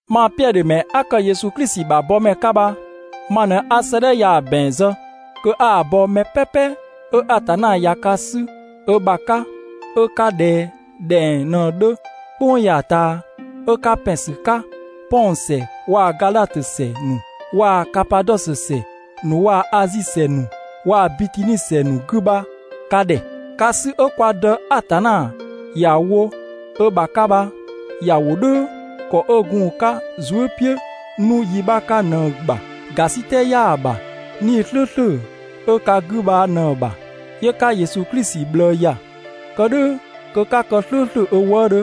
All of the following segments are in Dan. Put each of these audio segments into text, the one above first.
Mang Piɛdhö ‑mɛ 'a ‑kë Yesu Klisi ‑bha bɔmɛ 'ka bha, ma ꞊në 'a 'sëëdhɛ ya‑ ‑bɛn zë kö 'a‑ bɔ mɛ "pɛpɛ 'ö Atanna ꞊ya ka 'sü ö ‑bha 'ka 'ö 'ka ꞊dhɛ ꞊dhɛng ꞊në‑ 'dhö "kpʋng ya‑ ꞊taa, 'ö 'ka ‑pɛn ‑sü 'ka Pɔn ‑sɛ waa‑ Gadhatö ‑sɛ ‑nu waa‑ Kapadɔsö ‑sɛ ‑nu waa‑ Azi ‑sɛ ‑nu waa‑ Bitini ‑sɛ ‑nu 'gü bha ka ‑dhɛ. Ka 'sü 'ö kwa Dë Atanna ‑ya wo ö ‑bha 'ka bha ‑ya wo "dhʋ̈ ‑kɔ 'ö gun‑ 'ka‑ zuë" "piʋ̈ 'nu yi 'bha 'ka ꞊në‑ ‑bha. ‑Gasitɛ 'yaa‑ ‑bha 'Nii‑ "slʋ̈ʋ̈slʋ̈ 'ö ka 'gü bha ꞊në‑ ‑bha, 'yö 'ka Yesu Klisi ꞊bhlëë ‑ya, kë "dhʋ̈ kö 'ka kë "slʋ̈ʋ̈slʋ̈ ö wëëdhö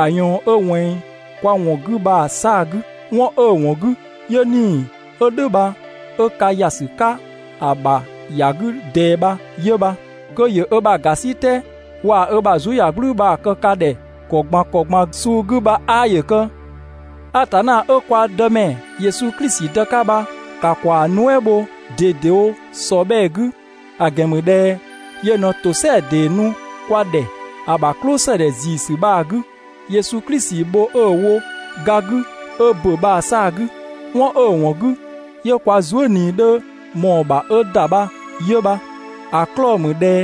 ‑a ꞊yɔɔn 'ö ꞊wɛnng kwa ‑wɔn 'gü bha‑ 'saa‑ 'gü, 'wɔn 'ö‑ ‑wɔn 'gü 'yö 'Nii‑ 'ö "dhʋ̈ bha 'ö ka ‑ya ‑sü 'ka ‑a ‑bha ‑ya 'gü ꞊dɛɛ bha 'yö bha. Kö ‑yö ö ‑bha ‑gasitɛ waa‑ ö ‑bha zuëyagblʋ̈ʋ̈‑ bha‑ kë ka ‑dhɛ ‑kɔ ꞊gban ‑kɔ ꞊gban suu 'gü bha 'aa ‑yö kë. Atanna 'ö kwa Dëmɛ Yesu Klisi Dë 'ka bha ‑ka ‑kwaa nuɛ" bho (꞊dedewo ‑sɔbhɛɛ 'gü)! ‑A ‑gɛn ‑mü ꞊dhɛ yö ꞊në ‑tosɛa ‑dee nu kwa ‑dhɛ ‑a ‑bha "klʋsëdhɛ ‑ziisü bha‑ 'gü, Yesu Klisi bho 'ö‑ wo ga 'gü 'ö ‑bö bha‑ 'saa‑ 'gü. 'Wɔn 'ö‑ ‑wɔn 'gü 'yö kwa zuë" ꞊nii 'dhö ꞊mɔɔ‑ ‑bha 'ö ‑da bha 'yö bha, ‑a 'klɔɔ‑ ‑mü ꞊dhɛ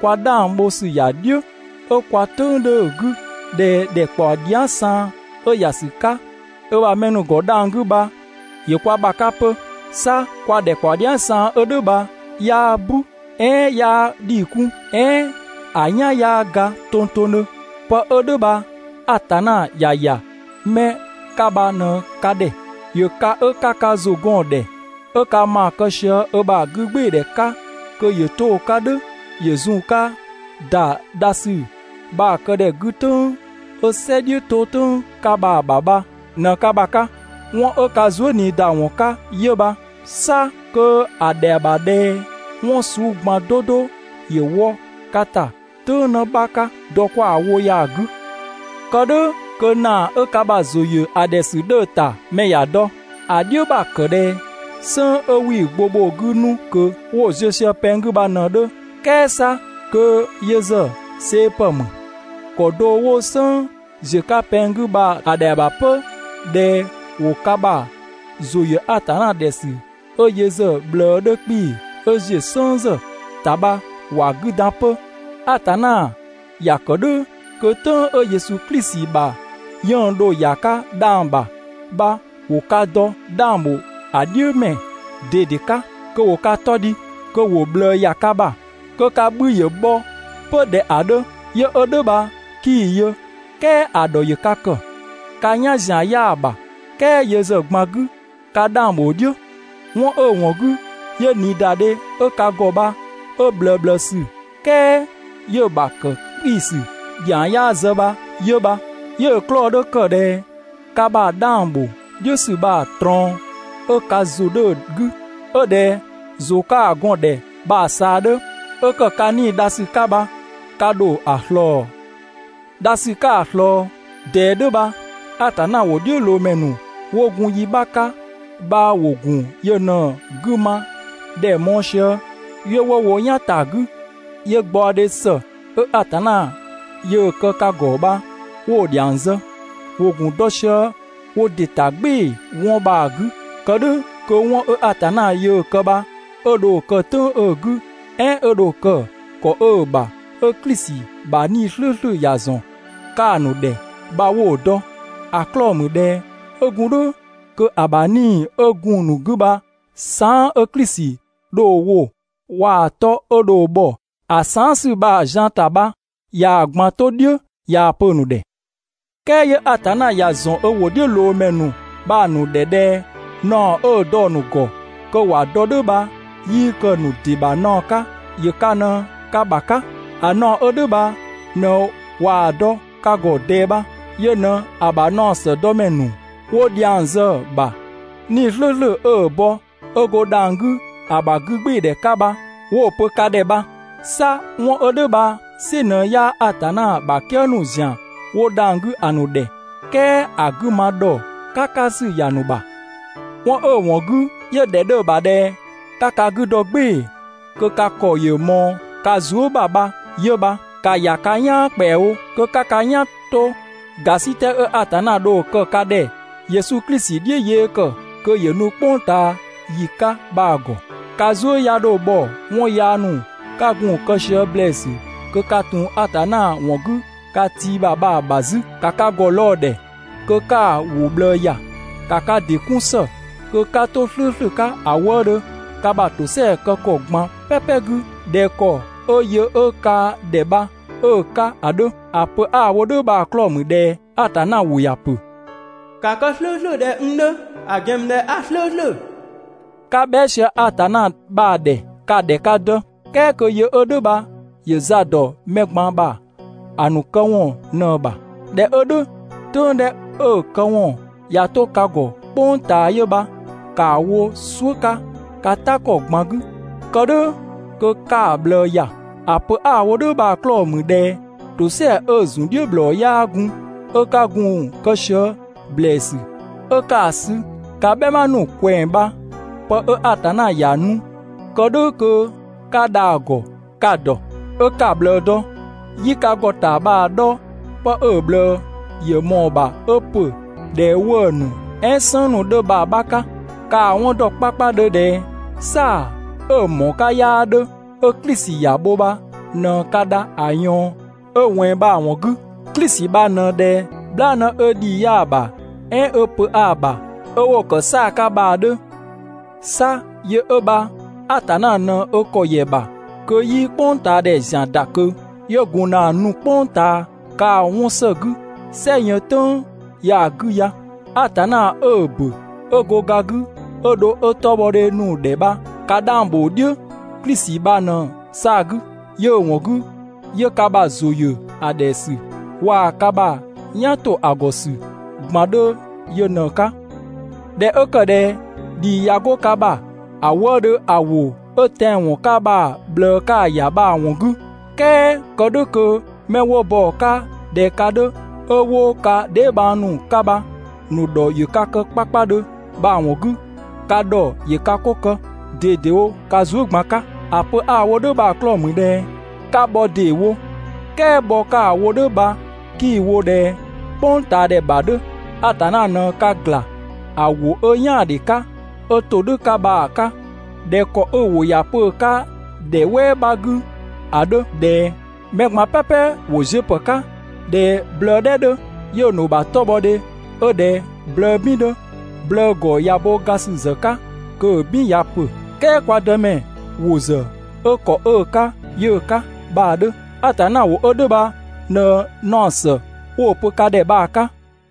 kwa 'dhang bho ‑sü ‑ya "dhiʋ̈ 'ö kwa "tʋ̈ng 'dhö‑ 'gü ꞊dhɛ ‑dhɛkpaɔ dhia" saan 'ö‑ ‑ya ‑sü 'ka ö ‑bha mɛ ‑nu ‑gɔ dhang‑ 'gü bha ‑yö kwa ‑bha 'ka 'pö. 'Sa kwa ‑dhɛkpaɔ dhia" saan 'ö "dhʋ̈ bha 'yaa "bu, "ɛɛn 'yaa ‑dhii 'kun, "ɛɛn ‑a "yan 'yaa ga tongtongdhö. Pë 'ö "dhʋ̈ bha Atanna ‑ya ‑ya 'mɛ 'ka bha ꞊në ka ‑dhɛ ‑Yö ka 'ö 'ka ka ‑zʋ gɔn‑ ‑dhɛ, 'ö ka ‑maa kë sië ö ‑bha 'gügbɩɩdhɛ 'ka kö ‑yö 'to‑ 'ka "dhʋ̈ ‑yö zun‑ 'ka ‑da dha ‑sü bha‑ këdhɛ 'gü "tʋ̈ng 'ö "sɛ "dhiʋ̈ 'to "tʋ̈ng 'ka bha‑ ‑bha bha ꞊në ka ‑bha 'ka. 'Wɔn 'ö ka zuëniida ‑wɔn 'ka 'yö bha, 'sa kö ‑a ‑dhɛa ‑bha ꞊dhɛ 'wɔn suu ꞊gban 'do 'do ‑yö wɔ ka ‑ta "tʋ̈ng 'në 'bha 'ka dɔ 'kwa‑ wo ya‑ 'gü. Kë "dhʋ̈ kö ‑naa 'ö ka ‑bha ‑zʋ ‑yö ‑a ‑dhɛ ‑sü 'dhö‑ ‑ta mɛ ‑ya dɔ, ‑A "dhiʋ̈ ‑bha ‑kë ꞊dhɛ "sënng 'wii‑ gbo bho 'gü 'nu ꞊kö 'wo‑ ‑ziö ꞊sië pɛng 'gü bha ꞊në‑ 'dhö. "Kɛɛ 'sa kö yö ‑zë see‑ ‑pë ‑mü. ‑Kɔ do 'wo "sënng ‑ziö 'ka pɛng 'gü bha‑ ‑dhɛa ‑bha 'pö ꞊dhɛ ‑wo ka ‑bha ‑zʋ ‑yö Atanna ‑dhɛ ‑sü 'ö yö ‑zë ꞊bhlëë 'dhö 'kpii‑ 'ö ‑ziö "sënng ‑zë ‑ta bha ‑wa 'gü dan 'pö, Atanna ‑ya kë "dhʋ̈ kö "tʋ̈ng 'ö Yesu Klisi ‑bha 'yënng‑ dho ‑ya 'ka dhang‑ ‑bha bha ‑wo ka dɔ 'dhang ‑bho ‑a "dhiʋ̈ ‑mɛ ꞊dede 'ka, kö ‑wo ka 'tɔ dhi, kö ‑wo ꞊bhlëë ‑ya ka ‑bha, kö ka 'bhü ‑yö bhɔ 'pö ꞊dhɛ ‑a 'dhö. Yö 'ö "dhʋ̈ bha 'kii‑ yö, "kɛɛ ‑a ‑dhɔ ‑yö ka ‑kë. Ka "yan ‑zian 'yaa‑ ‑bha "kɛɛ yö ‑zë ꞊gban 'gü ka 'dhang ‑bho "dhiʋ̈. 'Wɔn 'ö‑ ‑wɔn 'gü 'yö ꞊niidadhe 'ö ka ‑gɔ bha 'ö ꞊bhlëëbhlëësü, "kɛɛ 'yö‑ ‑bha ‑kë 'kpiisü ‑sü ‑dhiang 'yaa zë bha 'yö bha. 'Yö‑ 'klɔɔ‑ 'dhö ‑kë ꞊dhɛ ka ‑bha 'dhang ‑bho "dhiʋ̈ ‑sü bha‑ ꞊trɔɔn 'ö ka ‑zʋ 'dhö‑ 'gü 'ö ꞊dhɛ ‑zʋ 'ka‑ gɔn‑ ‑dhɛ bha‑ ꞊saa 'dhö, 'ö ‑kë ka 'nii‑ dha ‑sü 'ka bha ka ‑dho ‑a ꞊slɔɔ. Dha ‑sü 'ka‑ ꞊slɔɔ ꞊dɛɛ "dhʋ̈ bha, Atanna ‑wʋdhiʋ̈loomɛ ‑nu 'wo gun yi 'bha 'ka bha ‑wo ‑gun yö ꞊në‑ 'gü ma ‑dhɛ mɔɔ‑ sië 'yö 'wo wo "yan ‑ta 'gü, 'yö gbaɔdhe ‑së 'ö Atanna yöö‑ kë ka ‑gɔ bha 'wo‑ ‑dhiang zë. ‑Wo ‑gun dɔ sië wo ‑dɩ ‑ta "gbɩɩ‑ 'wɔn bha‑ 'gü, kë "dhʋ̈ kö 'wɔn 'ö Atanna yöö‑ kë bha 'ö dho‑ kë "tʋ̈ng 'ö‑ 'gü, "ɛɛn 'ö dho‑ kë ‑kɔ 'ö‑ ‑bha 'ö Klisi ‑bha 'Nii‑ "slʋ̈ʋ̈slʋ̈ ‑ya ‑zɔn 'ka‑ ‑nu ‑dhɛ bha 'wo‑ dɔ. ‑A 'klɔɔ‑ ‑mü ꞊dhɛ 'ö gun "dhʋ̈ kö ‑a ‑bha 'Nii‑ 'ö gun‑ ‑nu 'gü bha saan" 'ö Klisi dho‑ wo, waa‑ 'tɔ 'ö dho bhɔ ‑a saan" ‑sü bha‑ zian‑ ‑ta bha ꞊yaa‑ ꞊gban 'to "dhiʋ̈ ꞊yaa‑ pö‑ ‑nu ‑dhɛ. "Kɛɛ 'yö Atanna ‑ya ‑zɔn ö ‑wʋdhiʋ̈loomɛ ‑nu bha‑ ‑nu ‑dhɛ ꞊dhɛ naɔ 'ö‑ dɔ‑ ‑nu ‑gɔ kö ‑wa dɔ "dhʋ̈ bha 'yii kë‑ ‑nu ‑dɩ ‑bha naɔ 'ka, ‑yö ka ꞊në ka ‑bha 'ka. ‑A naɔ 'ö "dhʋ̈ bha ꞊në ꞊waa‑ dɔ ka ‑gɔ ꞊dɛɛ bha. Yö ꞊në ‑a ‑bha naɔ ‑së dɔ ‑mɛ ‑nu, 'wo dhiang zë‑ ‑bha 'Nii‑ "slʋ̈ʋ̈slʋ̈ 'ö‑ bɔ 'ö 'go dhang‑ 'gü ‑a ‑bha 'gügbɩɩdhɛ 'ka bha 'wo‑ pö ka ‑dhɛ bha. 'Sa 'wɔn 'ö "dhʋ̈ bha‑ "sɩ ꞊në 'yaa Atanna ‑bha "kië ‑nu ‑zian 'wo dhang‑ 'gü ‑a ‑nu ‑dhɛ, "kɛɛ ‑a 'gü ma ‑dhɔ "kakasü ‑ya ‑nu ‑bha. 'Wɔn 'ö‑ ‑wɔn 'gü 'yö‑ ‑dhɛ 'dhö‑ ‑bha ꞊dhɛ 'ka ka 'gü dɔ "gbɩɩ‑ kö ka ‑kɔ ‑yö ꞊mɔɔ ka zuë" ‑bha bha 'yö bha. ‑Ka ‑ya ka "yaan ‑kpɛawo kö 'ka ka "yan 'to ‑gasitɛ 'ö Atanna dho‑ kë ka ‑dhɛ Yesu Klisi "dhiʋ̈ yee ‑kë kö ‑yö nu "kpʋng ꞊taa ‑yi 'ka bha‑ ‑gɔ. Ka zuë" 'ya 'dho bhɔ 'wɔn yaa ‑nu 'ka gun‑ kë sië ‑blɛɛsü kö ka ‑tun Atanna ‑wɔn 'gü ka tii ‑bha bha‑ ‑bha 'zü. ‑Ka ka ‑gɔ lɔɔ‑ ‑dhɛ kö 'ka‑ ‑wʋ ꞊bhlëë ‑ya. ‑Ka ka ‑dɩ 'kun ‑së kö 'ka 'to "slʋ̈ʋ̈slʋ̈ 'ka ‑a wëëdhö ka ‑bha ‑tosɛa kë ‑kɔ ꞊gban "pɛpɛ 'gü ꞊dhɛ ‑kɔ 'ö yö 'ö ka ‑dhɛ bha 'ö‑ 'ka ‑a 'dhö. ‑A pö 'a‑ wo "dhʋ̈ bha‑ 'klɔɔ‑ ‑mü ꞊dhɛ Atanna ‑wʋ ‑ya pö: «‑Ka kë "slʋ̈ʋ̈slʋ̈ ꞊dhɛ n 'dhö, ‑a ‑gɛn ‑mü ꞊dhɛ a "slʋ̈ʋ̈slʋ̈.» 'Ka bhɛa" sië Atanna bha‑ ‑dhɛ, ka‑ ‑dhɛ ka Dë, "Kɛɛ kö yö 'ö "dhʋ̈ bha ‑yö za ‑dɔ mɛ ꞊gban ‑bha ‑a ‑nu këwɔn ꞊në‑ ‑bha. ꞊Dhɛ 'ö "dhʋ̈, "tʋ̈ng 'dhɛ 'ö‑ këwɔn ꞊ya 'to ka ‑gɔ "kpʋng ꞊taa yö bha, ‑kaa wo "suʋ̈ 'ka ka "ta ‑kɔ ꞊gban 'gü, kë "dhʋ̈ kö 'ka‑ ꞊bhlëë ‑ya. ‑A pö 'a‑ wo "dhʋ̈ bha‑ 'klɔɔ‑ ‑mü ꞊dhɛ ‑tosɛa 'ö‑ ‑zun "dhiʋ̈ ‑bhlɔɔ 'yaa gun 'ö 'ka gun‑ kë sië ‑blɛɛsü 'ö 'ka‑ sü ka "bhɛma ‑nu ꞊kwɛɛ‑ bha, pë 'ö Atanna ‑ya nu, kë "dhʋ̈ kö 'ka dha‑ ‑gɔ ka‑ ‑dɔ, 'ö 'ka‑ ꞊bhlëë dɔ. 'Yii ka ‑gɔta bha‑ 'dhɔ 'pë 'ö‑ ꞊bhlëë ‑yö ꞊mɔɔ‑ ‑bha 'ö ‑pö ꞊dhɛ 'wëë‑ ‑nu "ɛɛn "sënng ‑nu 'dhö bha‑ 'bha 'ka. Ka‑ 'wɔn ‑dɔ 'kpakpadhö ꞊dhɛ "saa‑ 'ö‑ ‑mɔɔ 'ka 'yaa 'dhö 'ö Klisi ‑ya bho bha ꞊në ka dha ‑a ꞊yɔɔn 'ö‑ ꞊wɛnng bha‑ 'ka. Klisi bha ꞊në ꞊dhɛ "bhlaanë 'ö ‑dhii 'yaa‑ ‑bha, "ɛɛn 'ö pö 'aa‑ ‑bha 'ö 'wo‑ ‑kë 'saa‑ 'ka bha‑ 'dhö. 'Sa yö 'ö bha Atanna ꞊në ö ‑kɔ ‑yɛ ‑bha kö 'yii "kpʋngtaadhɛ ‑zian ‑da ꞊kö, 'yö gun ‑na nu "kpʋng ꞊taa kaa 'wɔn ‑së 'gü "sɛ yën "tʋ̈ng ya‑ 'gü ya. Atanna 'ö‑ ‑bö 'ö go ga 'gü 'ö dho 'ö 'tɔbhɔdhe nu‑ ‑dhɛ bha ka 'dhang ‑bho "dhiʋ̈ Klisi bha ꞊në‑ 'saa‑ 'gü, 'yö‑ ‑wɔn 'gü 'yö ka ‑bha ‑zʋ ‑yö ‑a ‑dhɛ ‑sü waa‑ ka ‑bha "yan ‑to ‑a ‑gɔ ‑sü ꞊gban 'dhö yö ꞊në‑ 'ka. ꞊Dhɛ 'ö ‑kë ꞊dhɛ ‑dhii ꞊ya 'go ka ‑bha ‑a wëëdhö ‑a ‑wʋ 'ö tɛanwɔn 'ka bha‑ ꞊bhlëë 'ka‑ ‑ya bha‑ ‑wɔn 'gü, "kɛɛ kë "dhʋ̈ kö 'mɛ 'wo bɔ‑ 'ka ꞊dhɛ ka 'dhö 'ö 'wo ka dheebhang ‑nu 'ka bha‑ ‑nu ‑dhɔ ‑yö ka kë 'kpakpadhö bha‑ ‑wɔn 'gü, ka ‑dhɔ ‑yö ka 'ko kë ꞊dedewo ka zuë" ꞊gban 'ka. ‑A pö 'a‑ wo "dhʋ̈ bha‑ 'klɔɔ‑ ‑mü ꞊dhɛ 'ka bhɔ ‑deewo. "Kɛɛ bhɔ 'ka‑ wo "dhʋ̈ bha 'kii‑ wo ꞊dhɛ "kpʋngtaadhɛ ‑bha 'dhö, Atanna ꞊në ka ‑gla, ‑a ‑wʋ 'ö "yaandhe 'ka, 'ö ‑todhʋ̈ 'ka bha‑ 'ka. ꞊Dhɛ ‑kɔ 'ö‑ ‑wʋ ‑ya pö‑ 'ka ‑dhɛ "wɛɛ 'bha 'gü ‑a 'dhö ꞊dhɛ: «Mɛ ꞊gban "pɛpɛ ‑wo ziö ‑pë 'ka ꞊dhɛ blëë "dhɛ 'dhö, 'yö‑ ‑nu ‑bha 'tɔbhɔdhe 'ö ꞊dhɛ blëë "bin 'dhö, blëë ‑gɔ ꞊ya bo ga ‑sü ‑zë 'ka kö‑ "bin ꞊ya ‑pö, "kɛɛ kwa Dëmɛ ‑wʋ ‑zë 'ö ‑kɔ 'ö‑ 'ka 'yö‑ 'ka» bha‑ 'dhö. Atanna ‑wʋ 'ö "dhʋ̈ bha ꞊në naɔ ‑së 'wo‑ pö ka ‑dhɛ bha‑ 'ka.